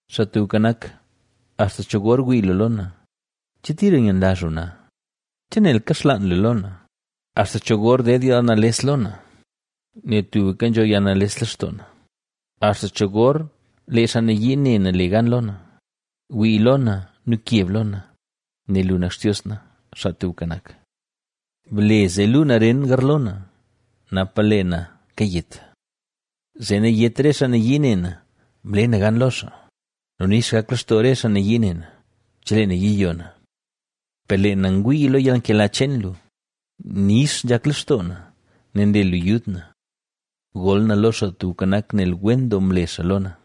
Xaa Tubka Nak, ¿axta cho gor wii lu lo na? ¿Che tira yenlazh lu na? ¿Che nel kaxlaan lu lo na? ¿Axta cho gor ded yalnales lo na, nel tubka nzho yalnales lextoo na? ¿Axta cho gor lee xaa nayii ne na le gan lo na? Wii lo na nu keb lo na, nel lu nak Xtios na, Xaa Tubka Nak. Ble zee luu naren garlo na, napa lee na kayet. Zee nayét re xaa nayii ne na: “Mle na gan lo xaa” nu nix gak lextoo re xaa nayii ne na, chelee na yiyo na. Per lee na ngwii lo yalnkela cheen lu; nix nzhak lextoo na, nel nle lu yud na. Gol na lo Xaa Tubka Nak, nel wen doo mle xaa lo na.